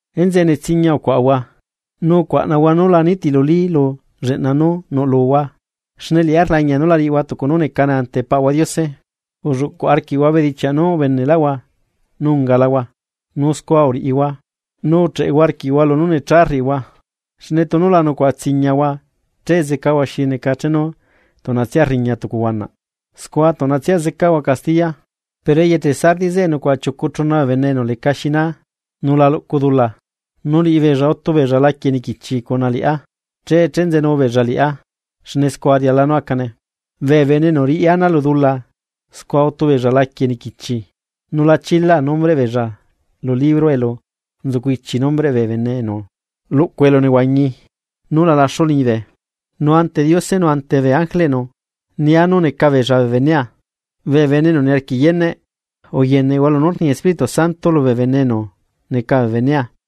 Enzeꞌe netsiñia ucuaꞌahua. Nu ucuaꞌnahua nu la nitiluli lu lleꞌna nú nuꞌluhua, xne liꞌá rlañia nú la riꞌihua tucu nú necane ante Paꞌahua Diose. Ulluꞌcuꞌ arquiꞌhua bedichiaꞌ nú ubeneꞌlaꞌhua nu ungalahua, nu scua uriꞌihua, nu ucheꞌehua arquiꞌhua lunú necha rriꞌihua. Xne tunu la nucuaꞌa tsiñiahua che zecahua xi neca chenu tuꞌnatsia rriña tucu huanaꞌ, scua tuꞌnatsia zecahua castiya. Pero eyeche Sardis zeꞌe nucuaꞌa chiucu chuna bee bene enu lecaxi naa nu la luꞌcu dula, nu liꞌibeella utu beella laquie niquichi cuna liꞌá che chenzenu beella liꞌá xne scua riala nú acane. Bee bene enu riꞌi ana lu dula scua utu beella laquie niquichi, nu la chilaa nombreꞌ beella lu libro elu nzucu ichi nombreꞌ bee bene enu luꞌcu elunehuañi nú la laxu liñibe. Nu ante Diose nu ante bee ángeleꞌnu nia nú neca beella bee benea. Bee bene enu niarquiꞌ yeneꞌ, uyeneꞌhua lunú rni Espíritu Santo lubee bene enu neca bee benea.”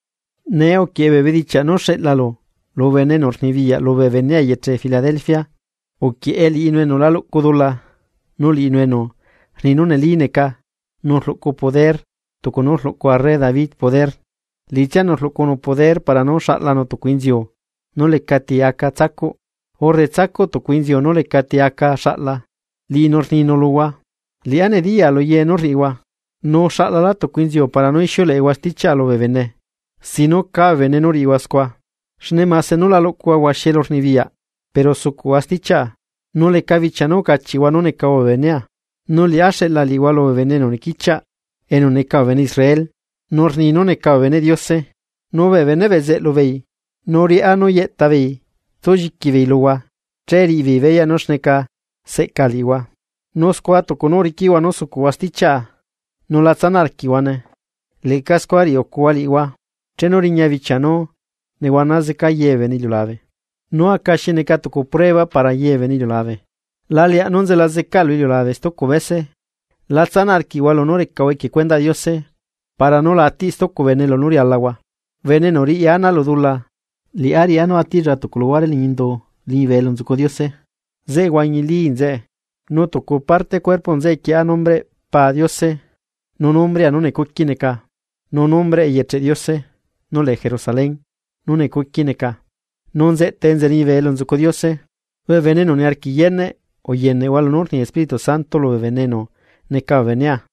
’Nee uquieꞌe bee bedichiaꞌ nú xeꞌlalu lu bene enu rnibiyaꞌ lubee benea eyeche Filadelfia: “Uquieꞌe liꞌinu enu la luꞌcu dula nu liꞌinu enu rni nú neli neca nu rluꞌcu poder tucu nú uluꞌcu arre David poder, liꞌitsianu rluꞌcunu poder para nú xaꞌlanu tucu inziu nú lecati aca tsacuꞌ, urre tsacuꞌ tucu inziu nú lecati aca xaꞌla liꞌinu rninu luhua: Liꞌá nediya luye nú rriꞌihua. Nu uxaꞌlala tucu inziu para nú ixiuleꞌehua stichiaꞌa lubee bene sin nú caa bee bene nú riꞌihua scua, xne mase nú la luꞌcuhua huaxi elurnibiyaꞌ pero sucuꞌhua stichiaꞌa, nu leca bichia nú ucachiꞌhua nú necahua bee benea. Nu liꞌá xeꞌla liꞌihua lubee bene enu nequichiaꞌ enu neca bee bene Israel, nu rni nú neca bee beneꞌ Diose, nu bee beneꞌ bezeꞌlu beei nu riꞌá nú yeꞌtabeei tsulliqui beei luhua che riꞌi beei beyaꞌ nú xneca seꞌca liꞌihua. Nu scua tucu nú uriquiꞌhua nú uzucuꞌhua stichiaꞌa nu lá tsanaꞌ arquiꞌhuane, leꞌca scua riꞌiucua liꞌihua chenu riña bichia nú nehuana zeca yebee bene lu iliulabe, nú aca xi neca tucu prueba para ye bee bene iliulabe. La leaꞌ nú nzela zeca lu iliulabe stucu bese. La tsanaꞌ arquiꞌhua lunú recahua equie cuendaꞌ Diose para nú la atiꞌ stucu bene lunú rialahua. Bene enu riꞌi ana lu dula liꞌá riꞌá nú atiꞌlla tucu luhuare liñi indu liñibe elu nzucu Diose, zeꞌe huañili nzeꞌe. Nu tucu parte cuerpoꞌ nzeꞌe quieꞌa nombreꞌ Pa Diose, nu nombrea nú necuqui neca, nu nombreꞌ eyecheꞌ Diose nú lee Jerusalén nú necuqui neca nu nzeꞌtae enza liñibe elu nzucu Diose. Bee bene enu niarquiꞌ yeneꞌ uyeneꞌhua lunú rni Espíritu Santo lubee bene enu neca bee benea.”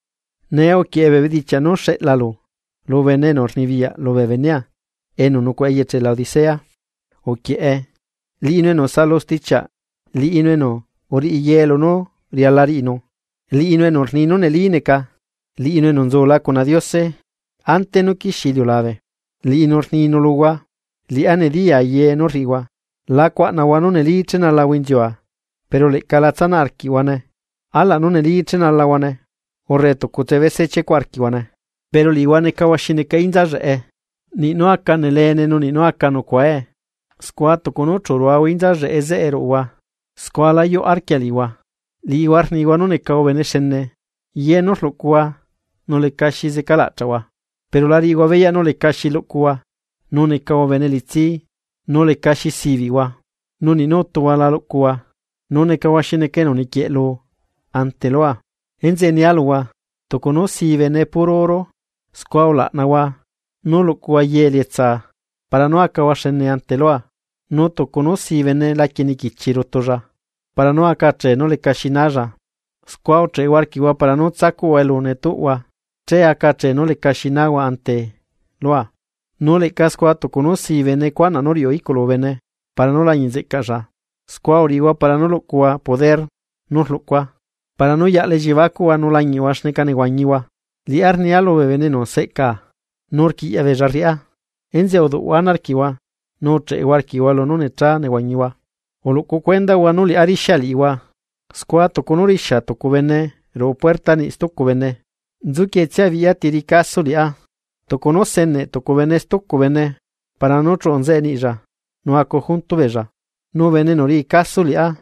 ’Nee uquieꞌe bee bedichiaꞌ nú xeꞌlalu lu bene enu rnibiyaꞌ lubee benea enu nucuaꞌa eyeche Laodicea: “Uquieꞌe, Liꞌinu enu saꞌalu stichiaꞌ, Liꞌinu enu uriꞌi ye lunú riala riꞌinu, Liꞌinu enu rni nú neli neca, Liꞌinu enu nzula cuna Diose ante nú quixie iliulabe, liꞌinu rninu luhua: Liꞌá nediyaa ye nú rriꞌihua. La cuaꞌnahua nú neli chenalahua inziua, pero leꞌca lá tsanaꞌ arquiꞌhuane, alaꞌ nú neli chenalahuane, ¡urre tucutse bese chiecuꞌ arquiꞌhuane! Pero liꞌihua necahua xi neca inza lleꞌe, niꞌ nú aca nelene nu niꞌ nú aca nucuae, scua tucu nú chu ruahua inza lleꞌe zeꞌe ruꞌuhua, scua la yuꞌ arquia liꞌihua. Liꞌihua rnihua nú necahua bene xene, ye nú rluꞌcuhua nu lecaxi zeca laꞌchaꞌhua. Pero la riꞌihua beyaꞌ nú lecaxi luꞌcuhua nu necahua bene elitsí, nu lecaxi sibiꞌhua, nu niꞌ nú utuhua la luꞌcuhua, nu necahua xi neca enu nequieꞌlu ante lua. Enzeꞌe nia luhua, tucu nú sii bene puro oro, scua ulaꞌnahua nú luꞌcuhua ye elietsaa, para nú acahua xene ante lua. Nu tucu nú si bene laquie niquichi rutulla para nú aca achee nú lecaxi nalla, scua ucheꞌehua arquiꞌhua para nú tsacuꞌhua elu netuꞌhua che aca achee nú lecaxi nahua ante lua. Nu leꞌca scua tucu nú sii bene cuanaꞌ nú riuꞌu iꞌculu bene para nú lañiꞌ nzeꞌcaꞌlla, scua uriꞌihua para nú luꞌcuhua poder nú rluꞌcua para nú yaꞌla elliebacuꞌhua nu lañiꞌhua xneca nehuañihua. Liꞌá rnia lubee bene enu seꞌcaa, nu rquiꞌyaꞌ beella rriꞌá. Enzeꞌe uduꞌhua ana arquiꞌhua, nu ucheꞌehua arquiꞌhua lunú necha nehuañihua. Uluꞌcu cuendahua nú liꞌá rixia liꞌihua, scua tucu nú rixia tucu bene ruꞌu puerta niꞌi stucu bene. Nzuquietsia biꞌya ti riꞌi caso Liꞌá. Tucu nú seneꞌ tucu bene stucu bene para nú chuꞌu nzeꞌe niꞌlla nu acu junto beella. Nu bene enu riꞌi caso Liꞌá,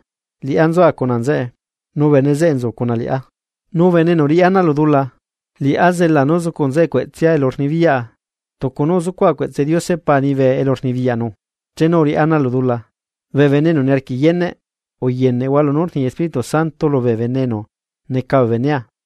Liꞌá nzua cuna nzeꞌe, nu bene zeꞌe nzu cuna Liꞌá. Nu bene enu riꞌi ana lu dula, Liꞌá zela nú zucu nzeꞌe cueꞌtsea elu rnibiyaꞌa, tucu nú uzucuaꞌa cueꞌtse Diose Pa liñibe elu rnibiyaꞌnu chenu uriꞌá ana lu dula. Bee bene enu niarquiꞌ yeneꞌ uyeneꞌhua lunú rni Espíritu Santo lubee bene enu neca bee benea.”